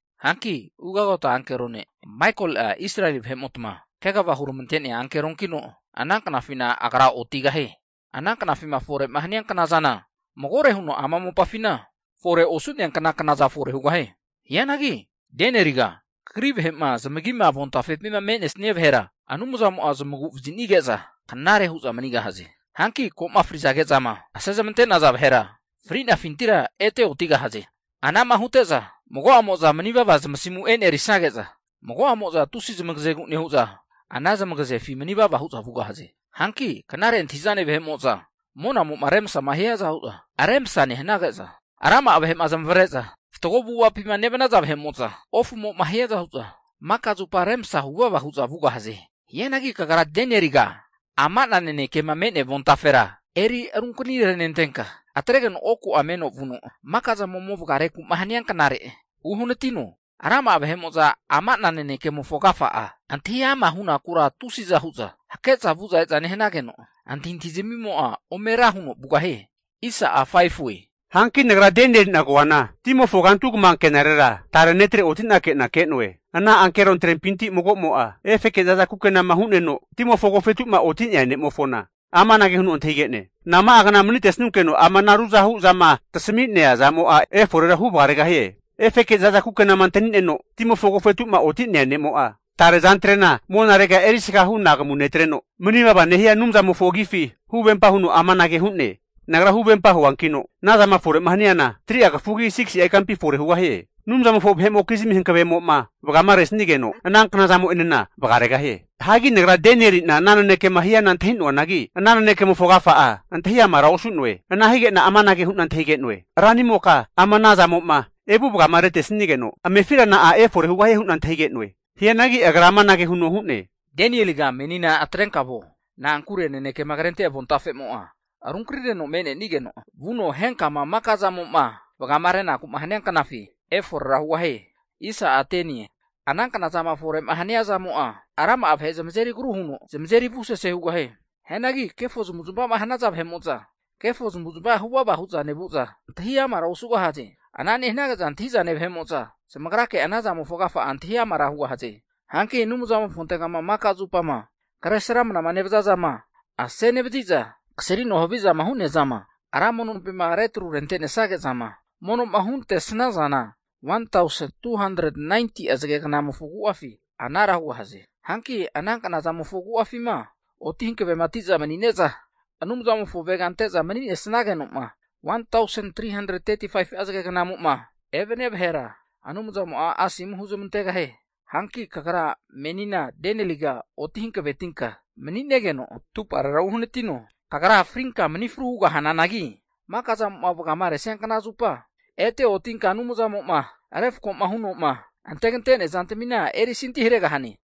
Hanki ugota ankero ne' Maikoli'a Israeli vahe'motma kegava huneramantea ankeronkino, ana knafina agra otigahie. Ana knafima fore'ma hania knazana, magore huno ama mopafina fore osu'neankna knaza fore hugahie. Hianagi Danieliga kagri vahe'ma zamagima avontafepima me'nesnia vahera Anumzamo'a zamagu vazi'nige'za knare hu'za manigahaze. Hanki ko'ma frizage'zama ase zamante'naza vahera fri'nafintira ete otigahaze. Anama hute'za mago'amo'za manivava zamasimu enerisnage'za, mago'amo'za tusi zamagazegu nehu'za ana zamagazefi manivava hu'za vugahaze. Hanki knare antahi'zane vahe'mo'za monamo'ma remsama hiaza hu'za remsa nehanage'za, rama'a vahe'ma zamavare'za fatgo avu'avapima nevanaza vahe'mo'za, ofumo'ma hiaza hu'za maka zupa remsa huvava hu'za vugahaze. Hianagi kagra Danieliga ama'na nanekema me'nea avontafera eri runkanirenentenka, atregeno oku meno vuno maka zama ome vagarenaku'ma hania knare uhanatino. Rama'a vahe'mo'za ama'na nanekemofo agafa'a antahi ama' hunakura tusiza hu'za hake'za vu'za e'za nehanageno antahintahizmimo'a ome ra huno vugahie. Hanki nagra Danieli'na koana, timofo kantu kama anke'narera tare netre oti'nake'na ke'noe. Ana ankerontrempinti mago'mo'a, efeke zaza kukenama hu'neno timofo agofetu'ma oti'nea ne'mofona amanage huno antahige'ne. Nama'a kna manitesnunkeno ama'na ruzahu'zama tasami'nea zamo'a eforera huvagaregahie? Higeno efeke zaza kukenama antani'neno, timofo agofetu'ma oti'nea ne'mo'a, tare azantre'na monarega erisga hu anagamu netreno, mani vavama nehia Anumzamofo agifi huvempa huno amanage hu'ne, Nagra huvempa huankino, anazama fore'ma haniana 3'a kafugi 6si'a ikampi fore hugahie. Anumzamofo vahe'mokizmi hankavemo'ma vagama resanigeno, ana knazamo'enena vagaregahie. Hagi nagra Danieli'na ana nanekema hiana antahi'noanagi, Ana nanekemofo agafa'a antahi amara osu'noe. Ana hige'na amanage hu'na antahige'noe, Ranimoka ama ana zamo'ma evu vagama retesigeno amefira na'a efore hugahie? hu'na antahige'noe. Hianagi agra amanage huno hu'ne, Danieliga menina atrenka vuo. Na'ankure nanekema krente avontafemo'a runkanireno me'nenigeno vuno henkama maka zamo'ma vagama renaku'ma hania knafi eforera hugahie. Ana knazama fore'ma hania zamo'a, rama'a vahe zamazeri agru huno zamazeri avusese hugahie. Hianagi kefo zamavu zamava'ma hanaza vahe'mo'za kefo zamavu zamava huvava hu'za nevu'za, antahiamara osugahaze. Ana nehanage'za antahi'zane vahe'mo'za zamagrake anazamofo agafa'a antahi amara hugahaze. Hanki Anumzamofontegama maka zupama kresramnama nevaza zama ase nevazi'za kasrino havizama hu'nea zama Ra mono nompima retru rente'nesnage'zama mono'ma huntesnazana 1tausen 2hantret 90'a zagegnamofo agu'afi anara hugahaze. Hanki ana knazamofo agu'afima oti hankaveti'za mani'neza Anumzamofoma avega ante'za mani'nesageno'ma 1tausen 3hantret 35'a zage gnamo'ma evania vahera Anumzamo'a asomu huzmantegahie. Hanki kagra menina Danieliga oti hankavetinka mani'negeno vuno atuparera uhanatino. Kagra frinka mani fru hugahananagi, maka zamo'ma vagama resania knazupa ete otinka Anumzamo'ma refko huno'ma antegante'nea zantamina erisanti haregahane.